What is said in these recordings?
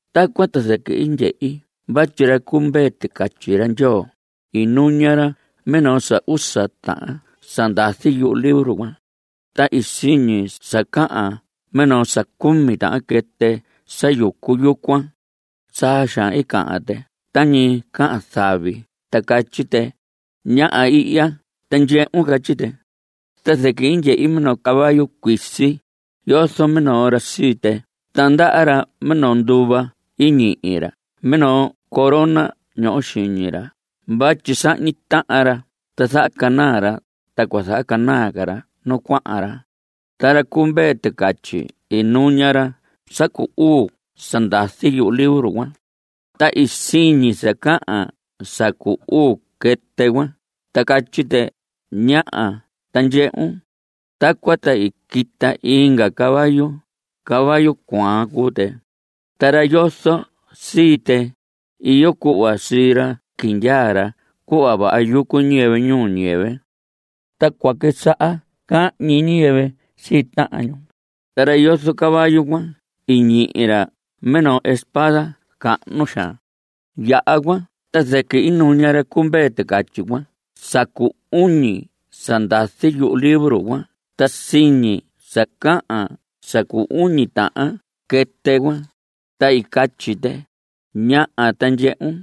Tacuan ta zɨquɨ i ndyehi vatyi ra cu Mvee Ticatyi ra Ndyoo, i nuña ra minoo sa usa tahan sa ndazi yuhu libro cuan. Ta siñi sa cahan minoo sa cumi tahan quɨtɨ sa yucu yucuan. Saa xaan i cahan tɨ tañi cahan zavi ta catyi tɨ: ¡Ñaha ihya ta ndyehun! Catyi tɨ. Ta zɨquɨ i ndyehi minoo caballo cuisi. Yozo minoo ra sii tɨ, ta ndaha ra minoo nduva. I ñihi ra minoo corona ñoho xiñi ra vatyi sahñi tahan ra ta zahacanaa ra, ta cua zahacanaa ca ra nu cuahan ra. Ta ra cu Mvee Ticatyi i nuña ra sa cu uu sa ndazi yuhu libro cuan. Ta siñi sa cahan sa cu uu quɨtɨ cuan, ta catyi tɨ: ¡Ñaha ta ndyehun! Tacuan ta i quita inga caballo. Caballo cuaha cuu tɨ. Ta ra yozo sii tɨ, iyo cuhva sii ra quindyaa ra cuhva vaha yucu ñiyɨvɨ ñuu ñiyɨvɨ. Ta cua quisaha cahñi ñiyɨvɨ sii tahan ñu. Ta ra yozo caballo cuan i ñihi ra minoo espada cahnu xaan. Yaha cuan ta zɨquɨ i nuña ra cu Mvee Ticatyi cuan sa cu uñi sa ndazi yuhu libro cuan ta siñi sa cahan sa cu uñi tahan quɨtɨ cuan, ta i catyi tɨ: ¡Ñaha ta ndyehun!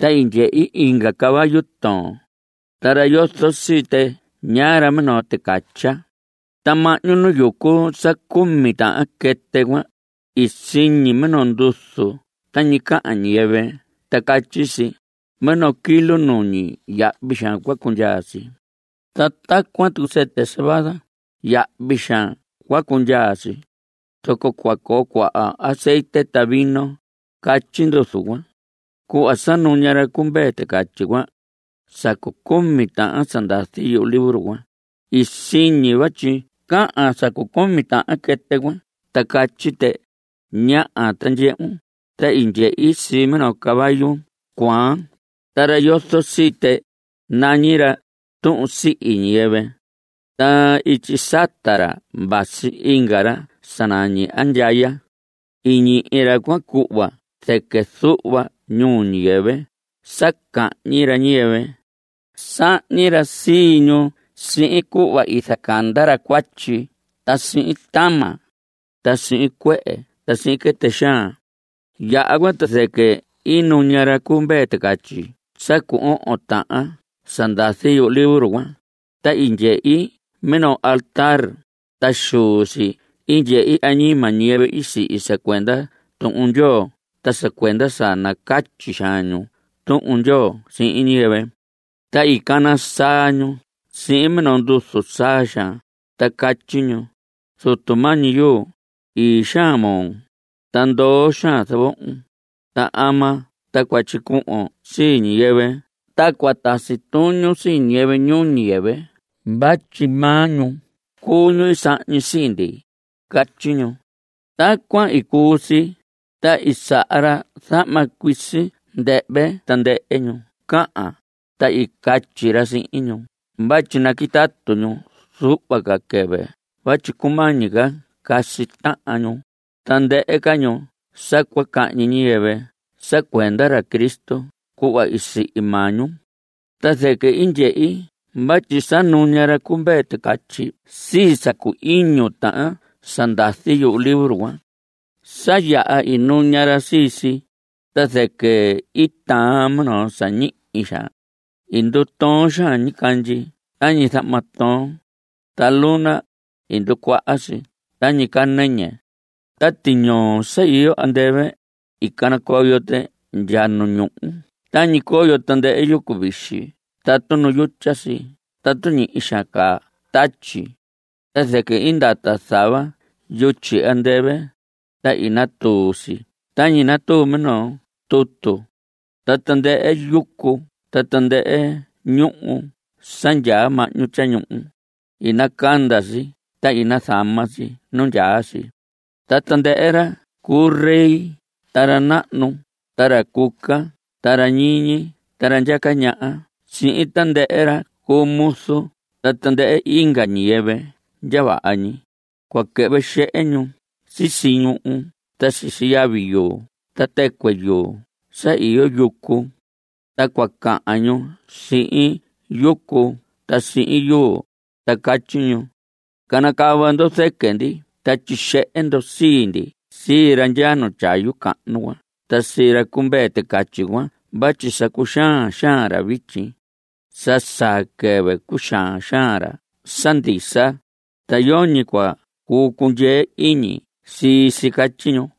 Ta i ndyehi inga caballo toon. Ta ra yozo sii tɨ ñaa ra minoo ticatya. Ta mahñu nu yucu sa cumi tahan quɨtɨ cuan, siñi minoo nduzu tañi cahan ñiyɨvɨ ta catyi si: Minoo kilo nuñi, yahvi xaan cua cundyaa si. Ta tacuan tucu sɨtɨ cebada, yahvi xaan cua cundyaa si. Zoco cua coo cuaha azetye ta vino. Catyi nduzu cuan. Cuhva sa nuña ra cu Mvee Ticatyi sa cu cumi tahan sa ndazi yuhu libro cuan, i siñi vatyi cahan sa cu cumi tahan quɨtɨ cuan ta catyi tɨ: ¡Ñaha ta ndyehun! Ta i ndyehi sii minoo caballo cuaan. Ta ra sa yozo sii tɨ, nañi ra Tuhun Sihi Ñiyɨvɨ. Ta ityi sata ra vasi inga ra sa nañi Andyaya. I ñihi ra cuan cuhva zɨquɨ zuhva ñuu ñiyɨvɨ sa cahñi ra ñiyɨvɨ. Sahñi ra sii ñu sihin cuhva i zacanda ra cuatyi ta sihin tama, ta sihin cuehe ta sihin quɨtɨ xaan. Yaha cuan, ta zɨquɨ i nuña ra cu Mvee Ticatyi sa cu ohon tahan sa ndazi yuhu libro cuan, ta i ndyehi minoo altar, ta xuu si i ndyehi añima ñiyɨvɨ i sihi sa cuenda Tuhun Ndyoo ta sa cuenda sa nacatyi xaan ñu Tuhun Ndyoo sihin ñiyɨvɨ. Ta i cana saa ñu sihin minoo nduzu saa xaan, ta catyi ñu: Zutu mañi yuu, ii xaan moo, ta ndoo xaan zavohon, ¿ta ama ta cua tyicuhvon sii ñiyɨvɨ ta cua tasi tuñun sii ñiyɨvɨ ñuu ñiyɨvɨ vatyi maa ñu cuu ñu i sahñi sii ndi? Catyi ñu. Tacuan i cuu si, ta i saha ra zahma cuisi ndɨhvɨ tandɨhɨ ñu cahan, ta i catyi ra sihin ñu vatyi naquitatu ñu zuhva ca quɨvɨ vatyi cumañi ca casi tahan ñu, tandɨhɨ ca ñu sa cua cahñi ñiyɨvɨ sa cuenda ra Cristo cuhva i sihi maa ñu. Ta zɨquɨ i ndyehi vatyi sa nuña ra cu Mvee Ticatyi sii sa cu iñu tahan sa ndazi yuhu libro cuan. Sa yaha i nuña ra sii si, ta zɨquɨ i taan minoo sa ñihi xaan. I ndutoon xaan ñicandyi tañi zahma toon. Ta luna, i nducuaha si tañi caa nɨñɨ. Ta tiñoo sa iyo andɨvɨ, i canacoyo tɨ ndya nu ñuhu tañi coyo tandɨhɨ yucu vixi tatu nu yutya si tatu ñihi xaan caa tatyi. Ta zɨquɨ i ndata zava yutyi andɨvɨ, ta i natuu si tañi natuu minoo tutu. Ta tandɨhɨ yucu ta tandɨhɨ ñuhu sa ndyaa mahñu tyañuhu, i nacanda si ta i nazama si nu ndyaa si. Ta tandɨhɨ ra cu rey ta ra nahnu ta ra cuca ta ra ñiñi ta ra ndyaca ñaha sihin tandɨhɨ ra cu muzu ta tandɨhɨ inga ñiyɨvɨ ndya vaha ñi, cua quɨhvɨ xehe ñu sisi ñuhu ta sisi yavi yuu ta tɨcuɨ yuu sa iyo yucu. Ta cua cahan ñu sihin yucu ta sihin yuu, ta catyi ñu: Canacava ndo zɨquɨ ndi, ta tyixehe ndo sii ndi sii ra ndyaa tyayu cahnu cuan ta sii ra cu Mvee Ticatyi cuan vatyi sa cuxaan xaan ra vityi. Sa saa quɨvɨ cuxaan xaan ra sa ndisa, ta yoñi cua cuu cundyee iñi sii si. Catyi ñu.